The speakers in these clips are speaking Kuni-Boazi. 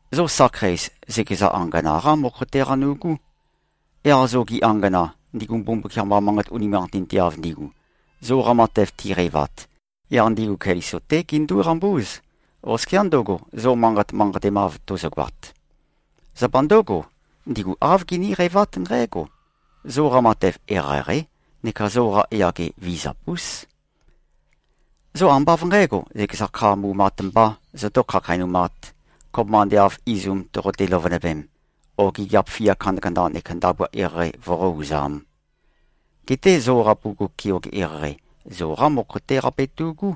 Zo sakheis, zøkeza angana-qá mokho-té qanu꞉gú. Yaq zogi angana, ndigu Mbumbukiam-qa manqat unimanqatinteav ndigu, zoqa matev tiqeivat, yaq ndigu Keliso-té gindúqambúz, oskiá ndøgo, zo manqat manqatemav tozogoat. Zapa ndǿgo, ndigu āv giníqeivát nqǽgo: Zoqa matev eqeieqeí neka zoqa yage vizap-ús. Zo ambá av nqǣgo, zøkeza kha mumat mbā zotó-khakheinumāt, kopømba ande av izum toqote-løvønøvem o gigiap fia kandakanda neka ndabua eqeieqei voqó-uzām. Geté zoqa bugug keoge eqeieqei, zoqá mokho-té qabetu꞉gú.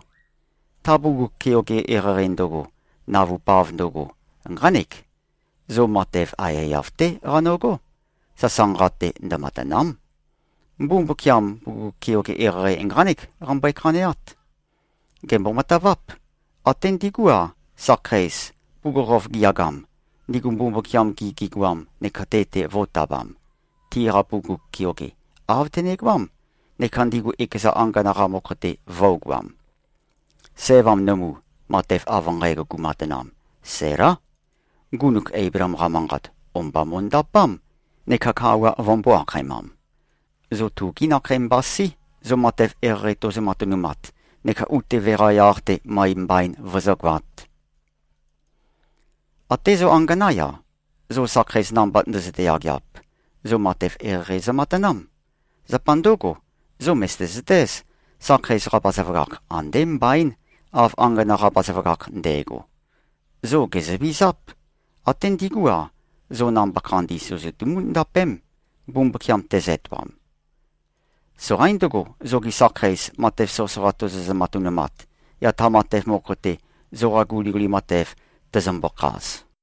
Ta bugug keoge eqeieqei ndøgo, navupav ndøgo, nqánek: Zo matev aiyaiyav-té qanøgó. Sasanqa-te ndømatàna᷄m. Mbumbukiam, bugug keoge eqeieqei nqánek qambøe-khaneát. Gèmbo-mataváp. Até ndigú-a, sakheis, bugukhokhof giyagam, ndigu Mbumbukiam-gi gigoam neka te-te vo꞉tabam, tiqa bugug keoge, āv tønegoám, neka ndigu ekeza angana-qa mokho-te vø̄ugoam. Sævam nømu, matev av nqægo gumatanam, Sælá. Ngunuk Eibleem-qa manqat, o-mba mo꞉ndapám, neka kawa vømbō-akhaemam. Zo tugí nakhei mbasí, zo matev eqeieqei tozo-matønumat neka utøve-qa yaq-te møe mbain vozógoāt. Até zo anganá-ya, zo sakheis namba ndøzøte-yageap, zo matev eqeieqei zømatanám. Zapa ndǿgo, zo mø̀zøte-zøtéz, sakheis-qa bazaføgakh andé mbaín, av angana-qa bazaføgakh ndægo. Zo gèzøvizáp. Até ndigú-a, zo namba khandi søzøtumú-ndapém, Mbumbukiam tezø-etoam. Soqaín ndøgo, zogi sakheis, matev soqøsoqa tozozø-matønumat, yaq ta matev mokho-te, zoqa guliguli matev, tøzømbø-khaz.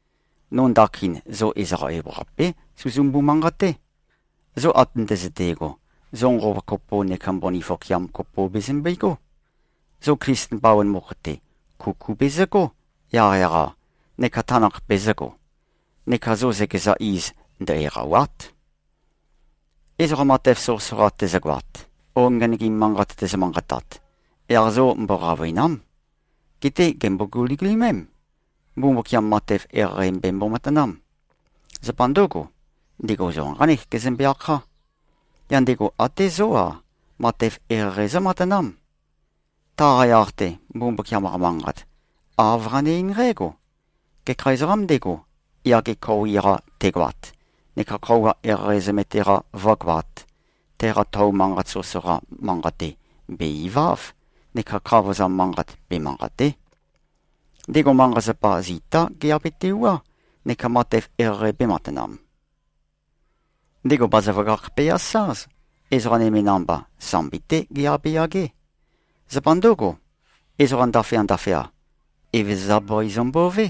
No ndakin, zo ezoqa ewaqapé suzumbu-manqaté. Zo ate ndøzøte꞉go, zo nqova kopo neka mbøni fokeam kopo bezømbegó. Zo Klisten bawan mokho-te, kuku bezøgó, yaqyaq-a, neka tanakh bezø̄go. Neka zo zøkeza iz, ndø-eqàwa᷄t. Ezoqa matev soqøsoqa tezøgoat o ngenøgim manqat tezø-manqatat, yaq zo mboqavøìna᷄m. Geté gèmbo-guligulimém. Mbumbukiam matev eqeieqei bembo-matanám. Zapa ndǿgo, ndego zo nqánek gezømbe-akhá. Yaq ndego até zó-a, matev eqeieqei zǿmatanám. Taqa yaq-te, Mbumbukiam-qa Manqat, āv qane-eín nqǽgo, “Gekha ezoqām ndego, yage khoui-qa tegoat neka khøuwa eqeieqei zømete-qa vǿgoāt, teqa tou manqat soqøsoqa manqate, bè-iváv neka khavozam manqat, bemanqàte᷄. Ndego manqa-zapa zitá geabetewuá neka matev eqeieqei bēmatanam. Ndego bazaføgakh be-asáz, ezoqa nøme namba, sambi-té geabeyagé. Zapa ndǿgo, ezoqa ndaføya-ndaføya, Evezøza bøi zømbové,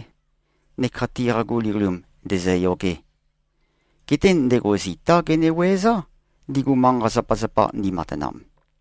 neka tiqa guligulim ndēzø̄yōgē. Geté ndego zitá gene-wuøezá, ndigu manqa-zapazapa ndimatanam.”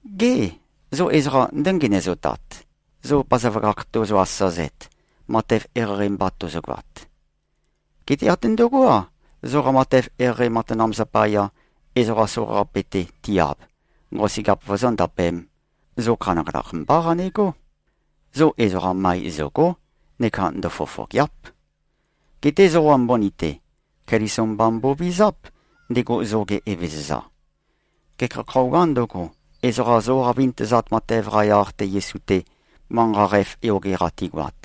Gê, zo ezoqa ndǿngenøzotat, zo bazaføgakh tozo-asazet, matev eqeieqei mba tozogoat? Geté até ndøgó-a, zoqa matev eqeieqei matanam zapaya, ezoqa soqaqape-te ti-ab, nqosøgeap vozóndapēm, zo khanakhanakh mbá qanegó. Zo ezoqa møe zø̀go᷄, neka ndøfofògea᷄p. Geté zoqa mbøni-te, Keliso mba mbovizáp, ndego zoge Evezøza. Gekha khøuwā ndøgo, ezoqa zoqa vintøzat matev-qa yaq-te Yesu-te, manqa qæf yoge-qa tigoat,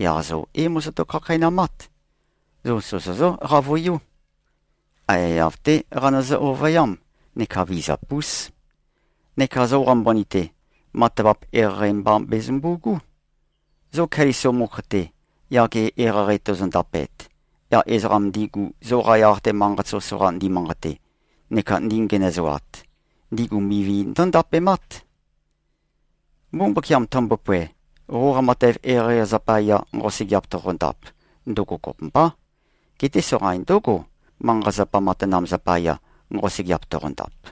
yaq zo é-mozoto-khakheinamát. Zo sozozǿ-qavøiú. Aiyaiyav-té qanøzø-ovøyám neka vizap-ús. Neka zoqa mbøni-te, matavap eqeieqei mba bezømbu꞉gú. Zo Keliso mokho-te, yage eqeieqei tozondapet, yaq ezoqam ndigu, zoqa yaq-te manqat soqøsoqa ndimanqate neka ndingenøzoat, ndigu mivi ndǿndapemát. Mbumbukiam tømbopoe, qoqa matev eqeieqei zapaya, nqosøgeap toqondap, ndøgo kopømbá. Geté soqain ndǿgo, manqa-zapa matanam zapaya, nqosøgeap toqondap.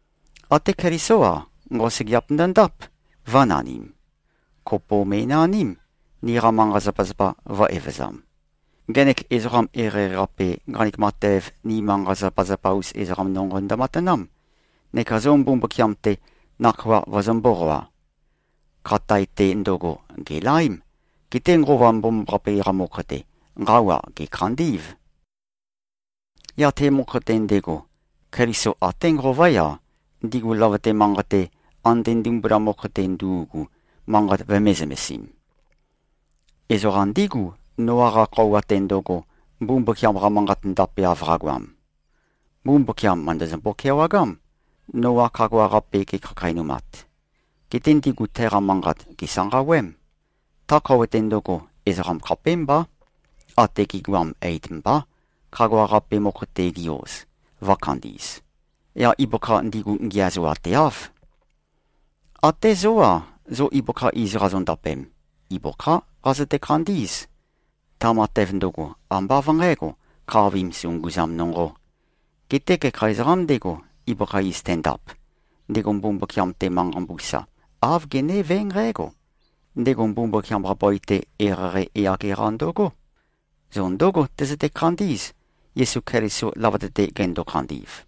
Até Kelisó-a, nqosøgeap ndøndáp, vø̄nanim. Kopo me꞉naním, niqa manqa-zapazapa vø̄-evøzam. Ngenek ezoqam eqeieqei-qape, nqanek matev, ni manqa-zapazapa-us ezoqam nonqo ndømatanám, neka zo Mbumbukiam-te, nakhoa vøzø̄-mboqoa. Khatae-te ndøgo, gèlaém. Geté Nqova Mbomambaqape-qa mokho-te, nqawa gèkhandí꞉v. Yaq te mokho-te ndego, Keliso até nqová-ya, ndigu løvøte manqei-te, ande ndimbula mokho-te ndu꞉gu, manqat vømē-zømesim. Ezoqa ndígu, Noa-qa khøuwa-te ndøgo, Mbumbukiam-qa manqat ndapeav qagoam. Mbumbukiam mø̀ndøzømbo-kewagám, Noa khagua-qape ge꞉khakheinumat. Geté ndigu teqa manqat gèsanqawém. Ta khøuwa-te ndøgo, ezoqam khapémbá, ate gi꞉goam, eit mbá, khagua-qape mokho-te gi-oz, vø̄khandi꞉z. Yaq ibøkha ndigu ngiæzoateáv. Até zó-a, zo ibøkha iz qazondapem, ibøkhá qazøte-khandí꞉z. Ta matev ndøgo, ambá av nqǣgo, khavim sunguzam nonqō. Geté gekha ezoqām ndego, ibøkha iz tendap, ndego Mbumbukiam-te manqa mbusa, āv genévé nqǽgo: Ndego Mbumbukiam-qa bøi-te eqeieqei yage-qa ndøgó. Zo ndǿgo tøzøte-khandí꞉z, Yesu Keliso løvøte-te gendo-khandi꞉v.